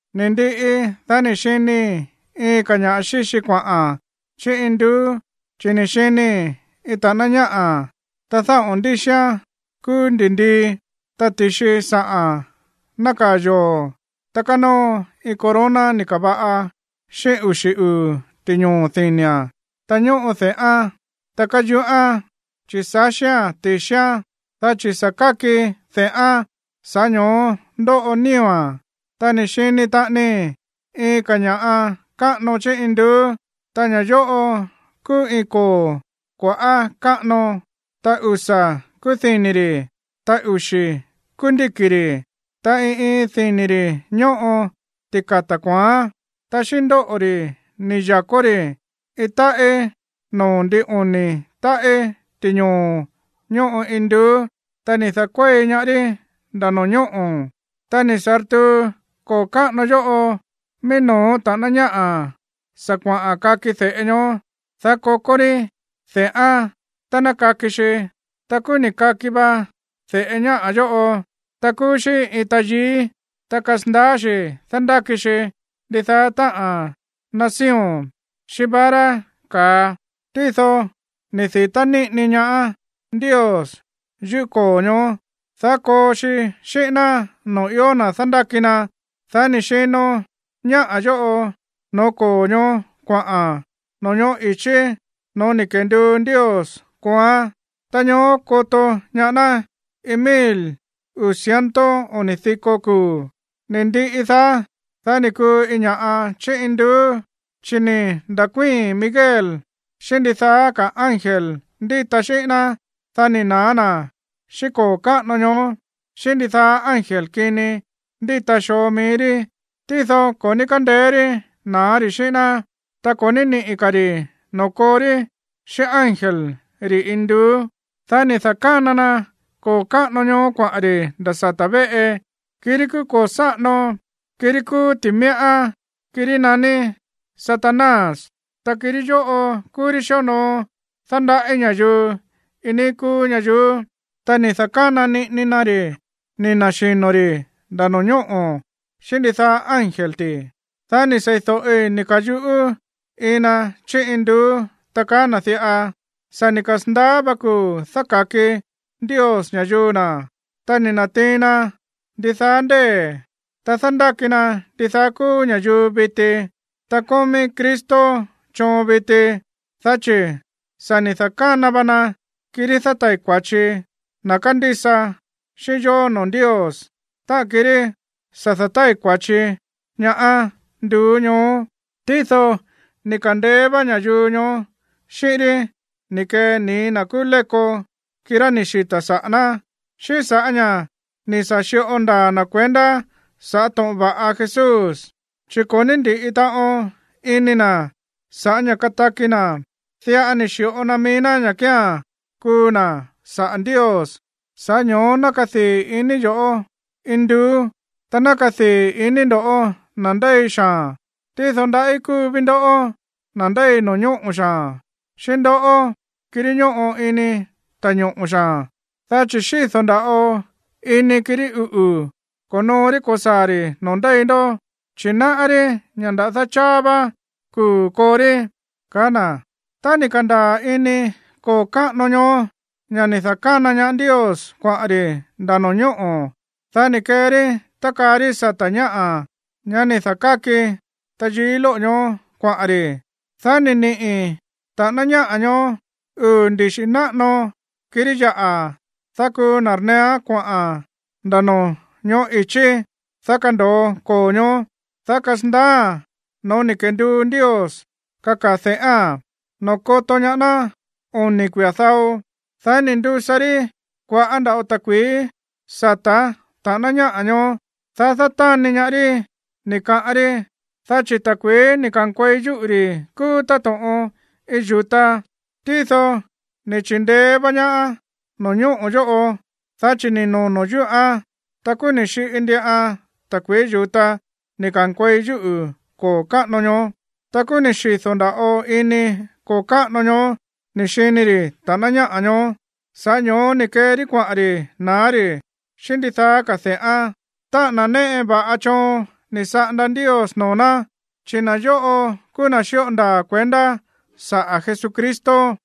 Ni̱ ndiꞌi, dá ni̱ xinii̱ iin ka̱ ña̱ꞌa xíxi kuaꞌa̱n chí induú, chi̱ ni̱ xinii̱ iin ta̱ꞌáná ñáꞌa̱, ta dáꞌo̱n ndíxián kúú ndi̱ndii, ta ti̱xi sa̱ꞌa̱n nákaa̱ yoo̱, ta kánóo iin corona ni̱ ka̱va̱ꞌa xíꞌín uxi̱ uu̱ ti̱ñoo̱ dini̱a̱n. Ta ñóꞌo de̱ꞌán, ta káyuꞌán, chi̱ sáxía̱n ti̱xián, dá chi̱ sa̱ káki de̱ꞌán, sa̱ꞌá ño̱ó ndóꞌo nío̱a̱n. Ta ni̱ xini taꞌanii iin ka̱ ña̱ꞌa káꞌano chí induú, ta ña̱ yóꞌo kúú iin koo̱ kua̱ꞌá káꞌano, ta usa̱ kúú dini̱ ri̱, ta uxi̱ kúú ndíki̱ ri̱, ta iin iin dini̱ ri̱ ñóꞌo tika̱ta̱ kua̱án. Ta xíꞌín ndóꞌo̱ ri̱ ni̱ ya̱kó ri̱ iin táꞌí noo̱ ndin oni̱ táꞌí ti̱ñoo̱ ñóꞌo induú, ta ni̱ da̱kuéi ñaá rí nda̱ no̱ñóꞌo̱. Ta ni̱ sa̱rtuu koo̱ káꞌano yóꞌo mií no̱ó ta̱ꞌáná ñáꞌa̱ sa̱ kuaꞌa̱n kaki de̱ꞌe ñoó, dá kokó rí de̱ꞌán tá ná kaki xi. Ta kúú ni̱ kaki va de̱ꞌe ñáꞌa̱ yóꞌo, ta kúú xí iin tayií. Ta kasandaá xi̱ dándáki xi ndidaá táꞌa̱n nación xíꞌín vara ka̱a. Tído ni̱ di̱tá níꞌini ñaá Ndios yuꞌú koo̱ ñoó, dá koo xi xíꞌín ná noo̱ ió na̱ dándáki na. Dá ni̱ xino ñáꞌa̱ yóꞌo no̱ó koo̱ ñoó kuaꞌa̱n no̱ñóꞌo̱ i̱chí no̱ó ni̱ kenduu Ndios kooán, ta ñoó koto ñaá ná iin mil uu̱ ciento oni̱ diko kuu̱. Ni̱ ndiꞌi daá, dá ni̱ kuu iin ña̱ꞌa chí induú, chi̱ ni̱ nda̱kuíi̱n Miguel xíꞌín ndidaá ka̱ ángel ndíta xíꞌín ná, dá ni̱ na̱á na̱ xíꞌín koo̱ káꞌano ñoó, xíꞌín ndidaá ángel kini ndíta xoo mií rí. Tído ko̱ ní kándeé rí na̱á ri̱ xíꞌín ná, ta ko̱ ní niꞌi̱ ka̱ ri̱ noo̱ koo rí xíꞌín ángel ri̱ induú. Dá ni̱ da̱kána na koo̱ káꞌano ñoó kuaꞌa̱n ri̱ nda̱ sata̱ véꞌe, kirí kúú koo̱ sáꞌano, kirí kúú ti̱míꞌá, kirí naní Satanás, ta kirí yóꞌo kúú rí xíonoo dándaꞌí ña̱yuu iin níí kúú ñayuú. Ta ni̱ da̱kána niꞌini na ri̱ ni̱ na̱xino̱ ri̱ nda̱ no̱ñóꞌo̱ xíꞌín ndidaá ángel ti̱. Dá ni̱ sei̱do̱ꞌi ni̱ ka̱yuꞌú iin na chí induú, ta kaá na̱ diꞌa: ―Sa̱ ni̱ kasa̱ndaá vá kuu̱ dáka̱ki Ndios ña̱yuu na̱, ta ni̱ na̱tiin na ndidaá ndée̱, ta dándáki na ndidaá kúú ña̱yuu viti. Ta kómí Cristo choon viti, dá chi̱ sa̱ ni̱ da̱kána va na kirí dátai̱ kua̱chi na̱ kándísa xi̱ꞌín yó noo̱ Ndios, táꞌa̱n kirí sa̱ dátai̱ kua̱chi ñaá nduú ñoó. Tído ni̱ ka̱ndeé vá ña̱yuu ñoó xíꞌín rí ni̱ kee nii̱ na̱ kúú léko, kirá ni̱ xita̱ saꞌa̱ ná, xíꞌín sa̱ꞌá ña̱ ni̱ sa̱ xi̱ꞌo ndaa̱ na̱ kuendá sa̱ꞌá to̱ꞌon va̱ꞌa Jesús, chi̱ ko̱ ní ndi̱ꞌi taꞌon ini na̱ sa̱ꞌá ña̱ kataki na̱, diꞌa ni̱ xi̱ꞌo na mií ña̱ kía̱n kuu na̱ saꞌa̱ Ndios. Sa̱ꞌá ño̱ó ná kadii̱ iní yo̱ꞌó, induú, ta ná kadii̱ iní ndo̱ꞌó, na̱ ndéi xaa̱n. Tído ndaꞌí kúu ví ndoꞌó, na̱ ndéi no̱ñóꞌo̱ xaa̱n, xíꞌín ndoꞌó, kirí ñóꞌo ini ta̱ñoꞌo̱ xaa̱n, dá chi̱ xído̱ nda̱ꞌo ini kirí uꞌu̱ ko̱noo rí ko̱saa̱ ri̱ noo̱ ndéi ndó, chi̱ náꞌá rí ña̱ nda̱dá cháá vá kuu̱ koo rí ―kaá na̱. Tá ni̱ ka̱ndaa̱ ini koo̱ káꞌano ñoó ña̱ ni̱ da̱kána ñaá Ndios kuaꞌa̱n ri̱ nda̱ no̱ñóꞌo̱, dá ni̱ kee rí tákaa rí sata̱ ñáꞌa̱, ñá ni̱ da̱káki tayií lóꞌo̱ ñoó, kuaꞌa̱n ri̱. Dá ni̱ niꞌi̱ ta̱ꞌáná ñáꞌa̱ ñoó uu̱ ndixi̱ náꞌano kirí yaꞌa̱, dá kuu nda̱rneeán koꞌa̱n nda̱ no̱ñóꞌo̱ i̱chí, dá kando̱o koo ñoó, dá kasandaáa̱n no̱ó ni̱ kenduu Ndios kakaa̱ de̱ꞌáa̱n, noo̱ koto ñaá ná oni̱ kuia̱ dao. Dá ni̱ ndusa rí kua̱ꞌá nda̱ꞌo ta̱kui̱í sata̱ ta̱ꞌáná ñáꞌa̱ ñoó, dá dátáni ñaá rí, ni̱ kaꞌán rí, dá chi̱ ta̱kui̱í ni̱ ka̱nkuei yúꞌu̱ ri̱ kúú táto̱ꞌon iin yu̱ta. Tído ni̱ chi̱ndeé vá ñaá no̱ñóꞌo̱ yóꞌo, dá chi̱ ni̱ nono̱ yúꞌán, ta kúú ni̱ xiꞌi ndiꞌan ta̱kui̱í yu̱ta ni̱ ka̱nkuei yúꞌu̱ koo̱ káꞌano ñoó. Ta kúú ni̱ xido̱ nda̱ꞌo ini koo̱ káꞌano ñoó ni̱ xini ri̱ ta̱ꞌáná ñáꞌa̱ ñoó. Sa̱ꞌá ño̱ó ni̱ kee rí kuaꞌa̱n ri̱ na̱á ri̱ xíꞌín ndidaá ka̱ de̱ꞌán, táꞌa̱n na̱ néꞌe va̱ꞌa choon ni̱ saꞌanda Ndios noo̱ ná, chi̱ na̱ yóꞌo kúú na̱ xíꞌo ndaa̱ kuendá saꞌa̱ Jesucristo.